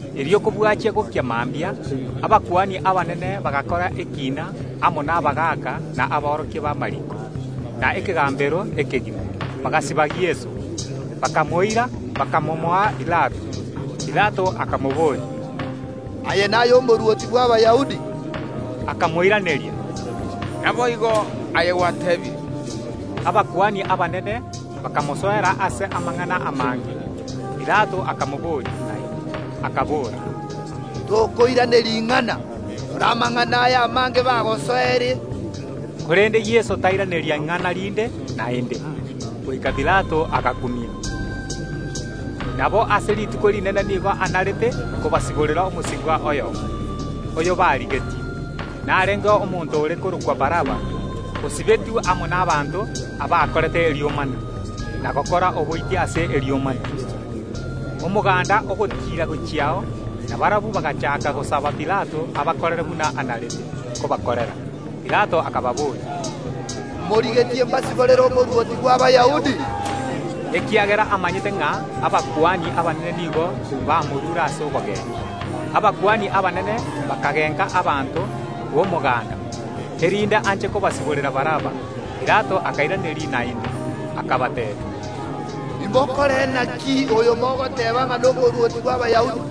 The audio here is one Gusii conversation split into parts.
Erio kobwachia gokia mambia, abakuani abanene bagakora ekiina amo nabagaaka na aborokia b’amariiko, na ekegambero ekegima. Bagasiba Yeso, bakamoira, bakamomoa Pilato. Pilato akamobooria, “Aye naye Omorwoti bw’Abayahudi?” Akamoiraneria, “Naboigo, aye gwateebire.” Abakuani abanene bakamosoera ase amang’ana amange. Pilato akamobooria naende, akabora, “Tokoiraneria ing’ana? Rora amang’ana aya amange bagosoereire.” Korende Yeso tairaneria ing’ana rinde naende, goika Pilato agakumia. Nabo ase rituko rinene nigo anarete kobasiborera omosibwa oyomo, oyobarigetie. Narengeo omonto ore korokwa Baraba, osibetwe amo nabaanto abakorete eburuburu, na gokora oboiti ase eburuburu. Omoganda ogotiira gochiao, na barabwo bagachaaka gosaba Pilato abakorere buna anarete kobakorera. Pilato akababoria, “Morigetie mbasiborere Omorwoti bw’Abayahudi?” Ekiagera amanyete ng’a abakuani abanene nigo bamorure ase obogechi. Abakuani abanene bakagenka abanto b’omoganda, erinde anche kobasiborera Baraba. Pilato akairaneria naende, akabateebia, “Imokore naki oyo mogoteeba ng’a n’Omorwoti bw’Abayahudi?”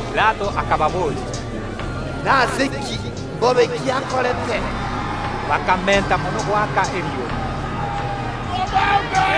Pilato akababoria, “Nase ki? Mbobe ki akorete?” Bakamenta mono goaka eriogi, “Mobambe!”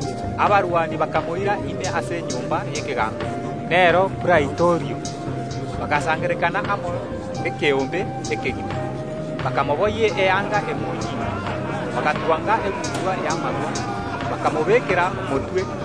Abarwani bakaira Yeso ime ase enyomba y’ekegambero (nero Praitorio), bagasangererekana amo ekeombe ekegima. Bakamoboyia eanga emonyinga, bagatwang’a egutwa y’amagwa, bakamobekera motwe,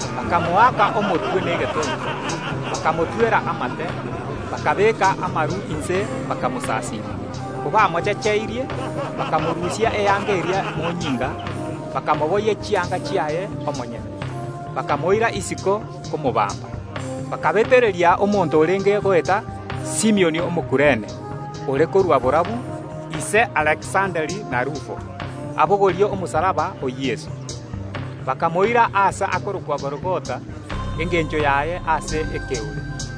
Bakamoaka omotwe negetonto, bakamotwera amate, bakabeka amaru inse, bakamosasiima. Kobamochecheirie, bakamorusia eanga eria emonyinga, bakamoboyia chianga chiaye omonyene. Bakamoira isiko komobamba. Bakabetereria omonto orenge goeta, Simioni Omokurene, ore korwa borabu, ise Alekisanda na Rufo, abogorie omosalaba o Yeso. Bakamoira aase akorokwa Gologotha (engencho yaye: Aase Ekeore).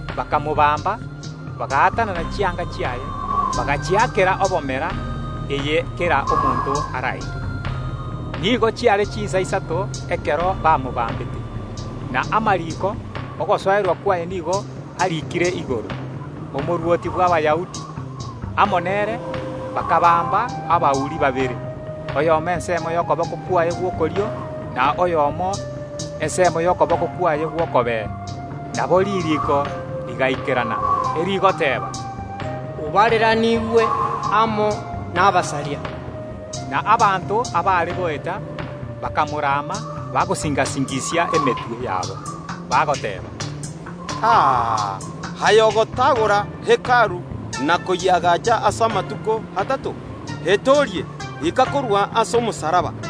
Bakamobamba, bagaatanana chianga chiaye, bagachiakera obomera eye kera omonto araire. Nigo chiare chinsa isato ekero bamobambete. Na amariiko y’ogosoerwa kwaye nigo ariikire igoro, “OMORWOTI BW’ABAYAHUDI.” Amo nere bakabamba abauri babere, oyomo ensemo y’okoboko kwaye gw’okorio, na oyonde okoboko gw’okobee. [ Nabo ririiko rigaikerana, erigoteeba, “Obareraniigwe amo nabasaria.”] Na abanto abaare goeta bakamorama, bagosinga‐singisia emetwe yabo, bagoteeba, “A! Aye oyogotagora Hekalu na koyeagacha ase amatuko atato, etoorie, ika korwa ase omosalaba!”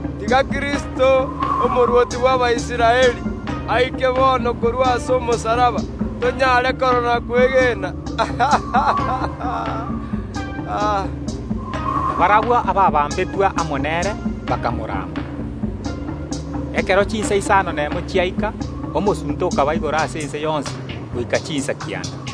Tiga Kristo, Omorwoti bw’Abaisraeli, aike bono korwa ase omosalaba, tonyare korora na kwegena!” Na barabwo abaabambetwe amo nere bakamoraama. Ekero chinsa isano nemo chiaika omosunte okaba igoro ase ense yonsi goika chinsa kianda.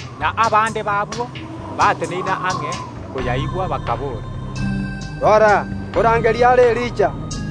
Na abande b’abwo bateneine ang’e koyaigwa bakaboora, “Rora, nkorangeria are Elija.”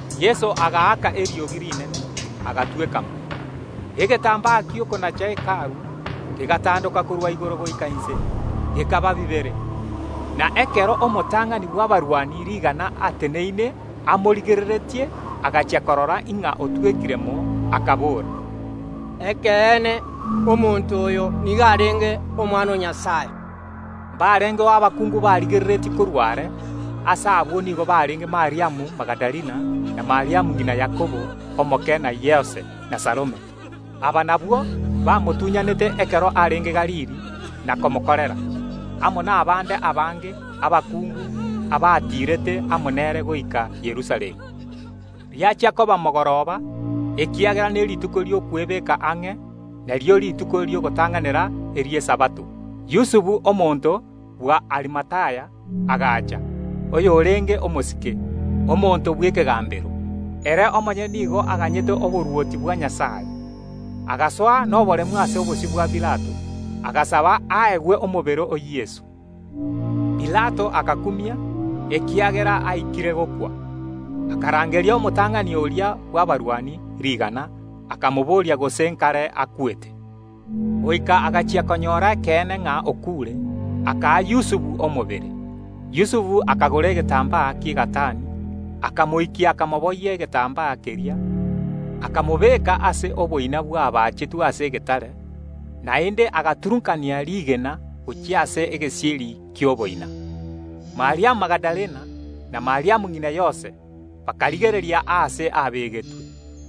Yeso agaaka eriogi rinene, agatweka mo. Egetambaa gi’okonacha Hekalu kegatondoka korwa igoro goika inse, gekaba bibere. Na ekero omotang’ani bw’abarwani rigana ateneine amorigereretie, agachia korora ng’a otwekire mo, akabora, “Ekeene, omonto oyo nigo arenge Omwana o Nyasae.” Mbarengeo abakungu barigereretie korwa are. Ase abwo nigo barenge Mariamu Magadalena na Mariamu ng’ina Yakobo omoke na Yose, na Salome. Aba nabwo bamotuny’anete ekero arenge Galili na komokorera, amo nabande abange abakungu abatiirete amo nere goika Yerusalemu. Riachia koba mogoroba, ekiagera nerituko ri’okwebeka ang’e, nario rituko ri’ogotang’anera Esabato, Yusufu omonto bw’Arimathaya agacha, oyorenge omosike, omonto bw’ekegambero. Ere omonyene nigo aganyete oborwoti bwa Nyasae; agasoa noboremu ase obosio bwa Pilato, agasaba aegwe omobere o Yeso. Pilato agakumia, ekiagera aikire gokwa, akarangeria omotang’ani oria bw’abarwani rigana, akamobooria gose nkare akwete. Goika agachia konyora ekeene ng’a okuure, akaa Yusufu omobere. Yusufu akagora egetambaa ki’egatani, akamoikia, akamoboyia egetambaa keria, akamobeka ase oboina bwabaachetwe ase egetare. Naende agaturunkania rigena gochia ase egesieri ki’oboina. Mariamu Magadalena na Mariamu ng’ina Yose bakarigereria aase abegetwe.